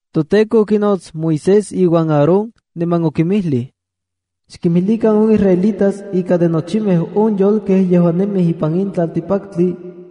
ToTEKO okinots Moisés iuan Aarón, niman okinmilij. “Xkinmijlikan on israelitas ika de nochimej on yolkej yejuan nemij ipan in tlaltikpaktli,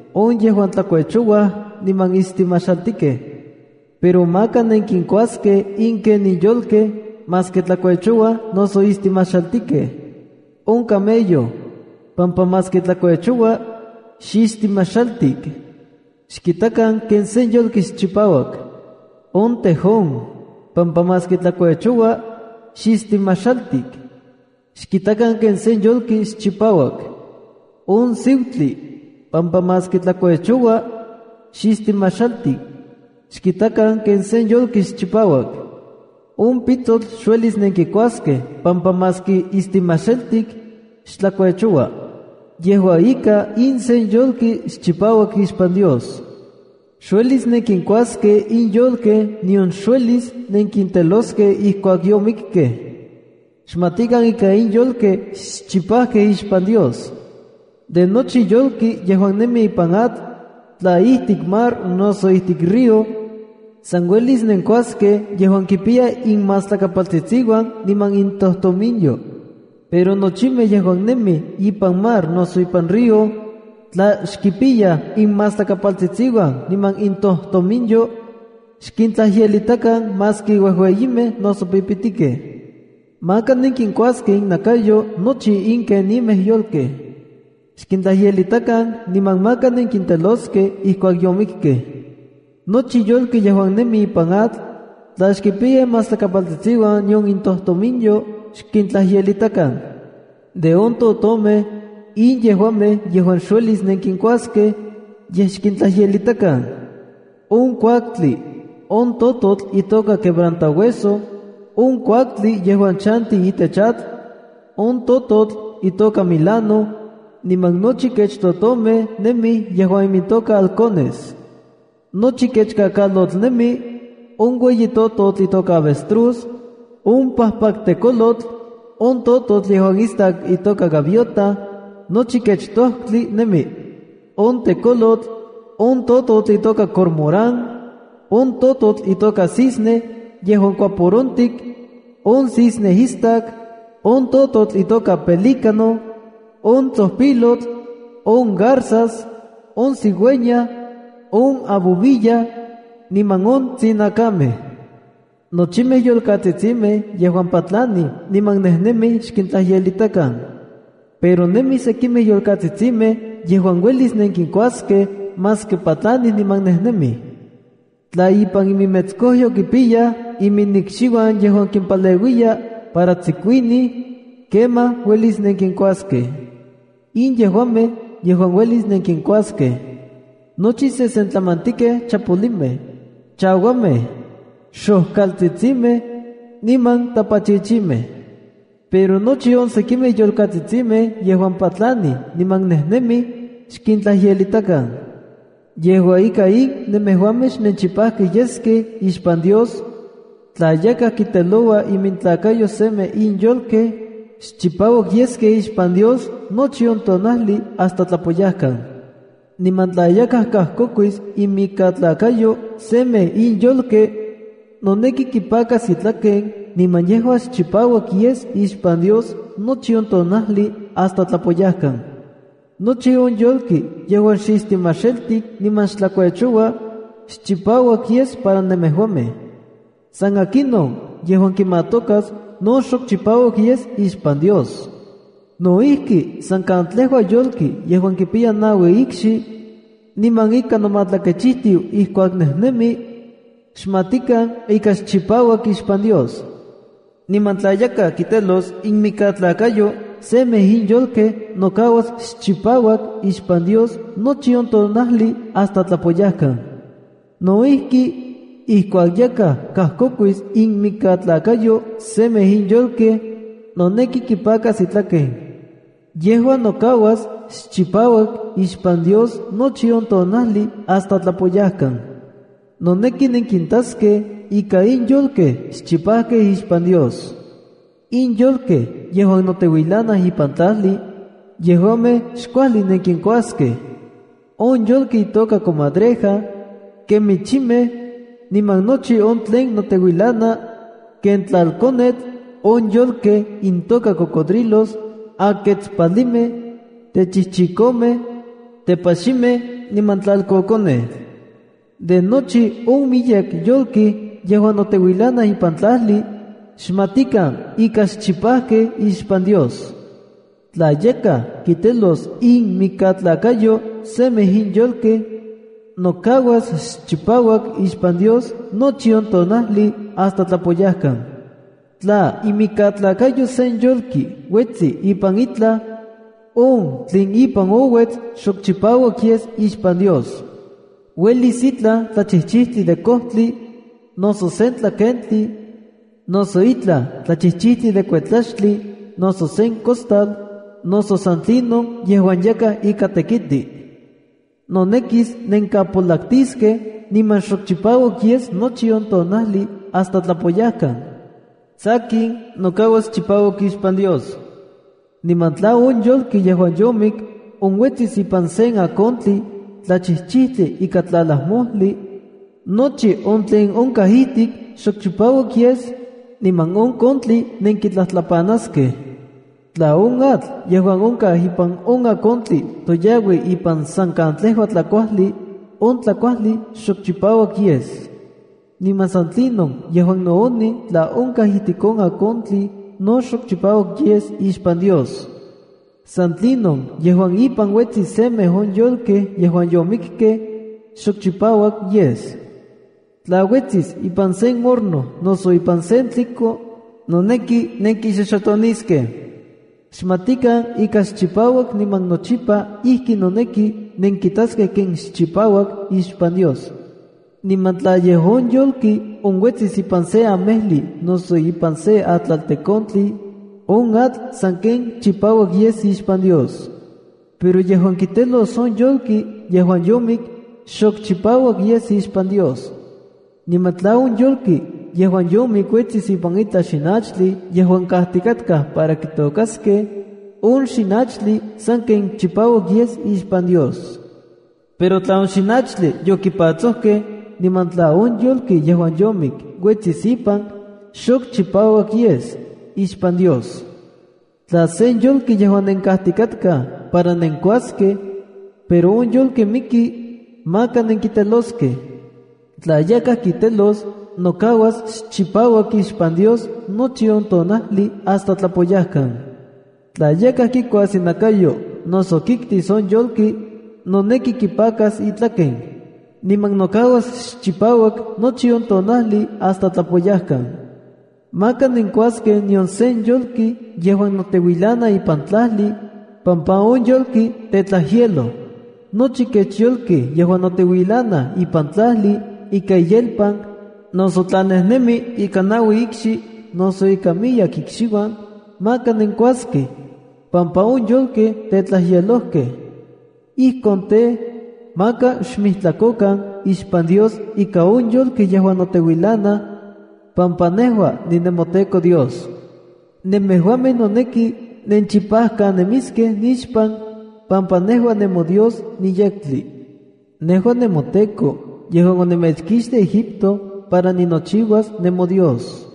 on yejuan tlakuechouaj niman istimaxaltikej. Pero maka nenkinkuaskej in kenin yolkej maski tlakuechouaj noso istimajxaltikej: ’On camello, pampa maski tlakuechoua, xistimajxaltik. Xkitakan ken sen yolki xchipauak. ’On tejón, pampa maski tlakuechoua, xistimajxaltik. Xkitakan ken sen yolki xchipauak. ’On siutli, pampa maski tlakuechoua, xistimajxaltik. Xkitakan ken sen yolki xchipauak. ’On pitsotl xuelis nenkikuaskej pampa maski istimajxaltik, xtlakuechoua. Yejua ika, in sen yolki xchipauak ixpan Dios. ’Xuelis nenkinkuaskej in yolkej nion xuelis nenkinteloskej ijkuak yomikkej. Xmatikan ika in yolkej xchipajkej ixpan Dios. ’De nochi yolki yejuan nemi ipan atl, tla ijtik mar noso ijtik río, san uelis nenkuaskej yejuan kipiyaj inmastlakapaltsitsiuan niman intojtominyo. Pero nochimej yejuan nemij ipan mar noso ipan río, tla xkipiyaj inmastlakapaltsitsiuan niman intojtominyo, xkintlajyelitakan maski uejueyimej noso pipitikej. Maka nenkikuaskej innakayo nochi in kenimej yolkej. Xkintlajyelitakan niman maka nenkinteloskej ijkuak yomikkej. Nochi yolki yejuan nemi ipan atl, tla xkipiya imastlakapaltsitsiuan nion itojtominyo, xkintlajyelitakan. ’De on totomej, in yejuamej yejuan xuelis nenkinkuaskej, yej xkintlajyelitakan: On kuaktli, on tototl itoka quebrantahueso, on kuaktli yejuan chanti itech atl, on tototl itoka milano, niman nochi kech totomej nemij yejuan imintoka halcones, nochi kech kakalotl nemi, on ueyi tototl itoka avestruz, on pajpaktekolotl, on tototl yejuan istak itoka gaviota, nochi kech tojtli nemi, on tekolotl, on tototl itoka cormorán, on tototl itoka cisne yejuan kuaporontik, on cisne istak, on tototl itoka pelícano, on tsojpilotl, on garzas, on cigüeña, on abubilla, niman on tsinakamej. ’Nochimej yolkatsitsimej yejuan patlanij niman nejnemij xkintlajyelitakan. Pero nemij sekimej yolkatsitsimej yejuan uelis nenkinkuaskej maski patlanij niman nejnemij. Tla ipan iminmetskojyo kipiyaj iminikxiuan yejuan kimpaleuiya para tsikuinij, kemaj uelis nenkinkuaskej. In yejuamej yejuan uelis nenkinkuaskej: nochi sesentlamantikej chapolimej, chauamej, xojkaltsitsimej, niman tapachichimej. Pero nochi on sekimej yolkatsitsimej yejuan patlanij niman nejnemij, xkintlajyelitikan. ’Yejua ika, in nemejuamej xnenchipajkej yeskej ixpan Dios: “Tla yakaj kinteloua inmikatlakayo semej in yolkej, xchipauak yeskej ixpan Dios nochi on tonajli hasta tlapoyajkan. ’Niman tla yakaj kajkokuis inmikatlakayo semej in yolkej, noneki kipakas itlaken niman yejua xchipauak yes ixpan Dios nochi on tonajli hasta tlapoyajkan. ’Nochi on yolki yejuan xistimaxaltik niman xtlakuechoua, xchipauak yes para nemejuamej. San akinon yejuan kimatokas no xok chipauak yes ixpan Dios. ’No ijki, san katlejua yolki yejuan kipiya naui ikxi, niman ika nomatlakechijtiu ijkuak nejnemi, xmatikan ika xchipauak ixpan Dios. Niman tla yakaj kitelos inmikatlakayo semej in yolkej nokauas xchipauak ixpan Dios nochi on tonajli hasta tlapoyajkan. No ijki, ijkuak yakaj kajkokuis inmikatlakayo semej in yolkej, noneki kipakas itlaken. Yejua nokauas xchipauak ixpan Dios nochi on tonajli hasta tlapoyajkan. Noneki nenkintaskej ika in yolkej xchipajkej ixpan Dios. ’In yolkej yejuan noteuilanaj ipan tlajli, yejuamej xkuajli nenkinkuaskej: on yolki itoka comadreja, kemichimej, niman nochi on tlen noteuilana, ken tlalkonetl, on yolkej intoka cocodrilos, aketspalimej, techijchikomej, tepaximej niman tlalkokonej. ’De nochi on miyek yolki yejuan noteuilanaj ipan tlajli, xmatikan ika xchipajkej ixpan Dios. Tla yakaj kitelos inmikatlakayo semej in yolkej, nokauas xchipauak ixpan Dios nochi on tonajli hasta tlapoyajkan. ’Tla imikatlakayo sen yolki uetsi ipan itlaj, on tlin ipan ouets xok chipauak yes ixpan Dios. Uelis itlaj tlachijchijtli de kojtli, noso sen tlakentli, noso itlaj tlachijchijtli de kuetlaxtli, noso sen costal, noso san tlinon yejuan yakaj ika tekiti. Nonekis nenkapolaktiskej niman xok chipauak yes nochi on tonajli hasta tlapoyajkan. Sakin, nokauas chipauak ixpan Dios. ’Niman tla on yolki yejuan yomik onuetsis ipan sen akontli tlachijchijtli ika tlalajmojli, nochi on tlen onkaj ijtik xok chipauak yes, niman on kontli nenkitlajtlapanaskej. Tla on atl yejuan onkaj ipan on akontli toyaui ipan san katlejua tlakuajli, on tlakuajli xok chipauak yes. Niman san tlinon yejuan nooni tla onkaj ijtik on akontli, no xchipauak yes ixpan Dios. San tlinon yejuan ipan uetsis semej on yolkej yejuan yomikkej, xok chipauak yes. Tla uetsis ipan sen horno noso ipan sen tliko, noneki nenkixoxotoniskej. Xmatikan ika xchipauak niman nochipa ijki noneki nenkitaskej ken xchipauak ixpan Dios. ’Niman tla yej on yolki onuetsis ipan sen amejli noso ipan sen atlaltekontli, on atl sanken chipauak yes ixpan Dios. Pero yejuan kitelos on yolki yejuan yomik, xok chipauak yes ixpan Dios. ’Niman tla on yolki yejuan yomik uetsis ipan itlaj xinachtli yejuan kajtikatkaj para kitôkaskej, on xinachtli sanken chipauak yes ixpan Dios. Pero tla on xinachtli yokipatsojkej, niman tla on yolki yejuan yomik uetsis ipan, xok chipauak yes ixpan Dios. ’Tla sen yolki yejuan nenkajtikatkaj para nenkuaskej, pero on yolki miki, maka nenkiteloskej. Tla yakaj kitelos, nokauas xchipauak ixpan Dios nochi on tonajli hasta tlapoyajkan. Tla yakaj kikuas inakayo noso kiktis on yolki, noneki kipakas itlaken, niman nokauas xchipauak nochi on tonajli hasta tlapoyajkan. ’Maka nenkuaskej nion sen yolki yejuan noteuilana ipan tlajli, pampa on yolki tetlajyeloj. ’Nochi kech yolki yejuan noteuilana ipan tlajli ika iyelpan, noso tla nejnemi ika naui ikxi, noso ika miyek ikxiuan, maka nenkuaskej, pampa on yolkej tetlajyelojkej. Ijkon tej, maka xmijtlakokan ixpan Dios ika on yolkej yejuan noteuilanaj, pampa nejua ninemoTEKO Dios. Nemejuamej noneki nenchipajkanemiskej nixpan, pampa nejua nemoDios niyektli. Nejua nemoTEKO, yejuan onemechkixtij Egipto para ninochiuas nemoDios.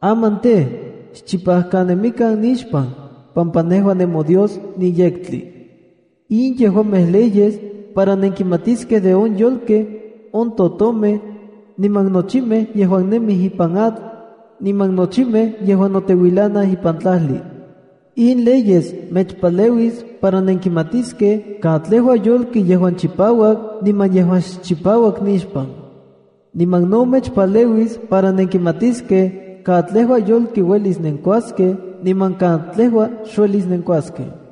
Aman tej, xchipajkanemikan nixpan, pampa nejua nemoDios niyektli.” In yejuamej leyes, para nenkimatiskej de on yolkej, on totomej, niman nochimej yejuan nemij ipan atl, niman nochimej yejuan noteuilanaj ipan tlajli. In leyes mechpaleuis para nenkimatiskej katlejua yolki yejuan chipauak niman yejuan xchipauak nixpan. Niman no mechpaleuis para nenkimatiskej katlejua yolki uelis nenkuaskej niman katlejua xuelis nenkuaskej.